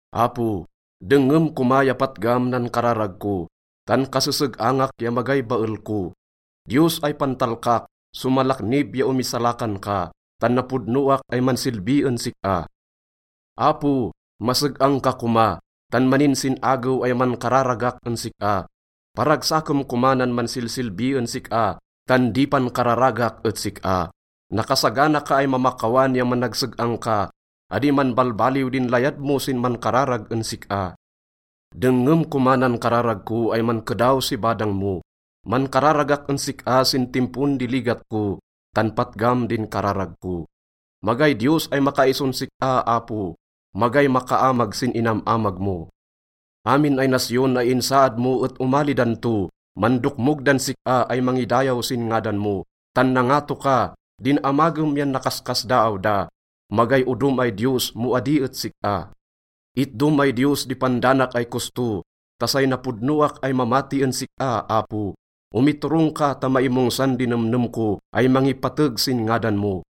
Apo, dengngem koma ya patgam nan kararag ko, tan kaseseg-angak ya magay bael ko. Diyos ay pantalkak, somalaknib ya omisalakan ka, tan napodnoak ay mansilbi en sik-a. Apo, maseg-ang ka koma, tan maninsin-agew ay mankararagak en sik-a. Paragsakem koma nan mansilsilbi en sik-a, tan di pankararagak et sik-a. Nakasagana ka ay mamakawan ya managseg-ang ka, adi manbalbaliw din layad mo sin mankararag en sik-a. Dengngem koma nan kararag ko ay mankedaw si badang mo. Mankararagak en sik-a sin timpon di ligat ko, tan patgam din kararag ko. Magay Diyos ay makaison sik-a, Apo, magay makaamag sin inam-amag mo. Amin ay nasyon ay insaad mo et omali dan to, mandokmog dan sik-a ay mangidayaw sin ngadan mo. Tan nangato ka, din amagem yan nakaskasdaaw da, magay odom ay Diyos mo adi et sik-a. Itdom ay Diyos di pandanak ay kosto ta say napodnoak ay mamati en sik-a, Apo. Omiturong ka ta maimongsan di nemnem ko ay mangipateg sin ngadan mo.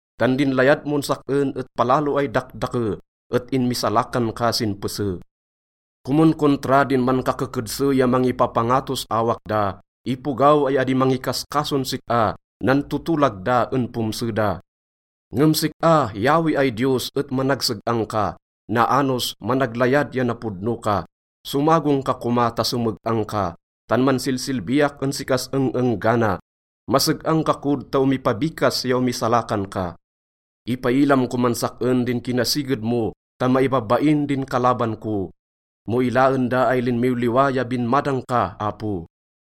Tan din layad mon sak-en et palalo ay dakdake, et inmisalakan ka sin pese. Komonkontra din mankakekedse ya mangipapangatos awak da, ipogaw ay adi mangikaskason sik-a. Nantotolag da en pomse da. Ngem sik-a, Yahweh ay Diyos, et managseg-ang ka, naanos, managlayad ya napodno ka. Somagong ka koma ta someg-ang ka, tan mansilsilbiak en sik-as eng-enggana. Maseg-ang ka kod ta omipabikas ya omisalakan ka. Ipailam koman sak-en din kinasiged mo ta maibabain din kalaban ko mo ilaen da ay linmiwliwa ya binmadang ka, Apo.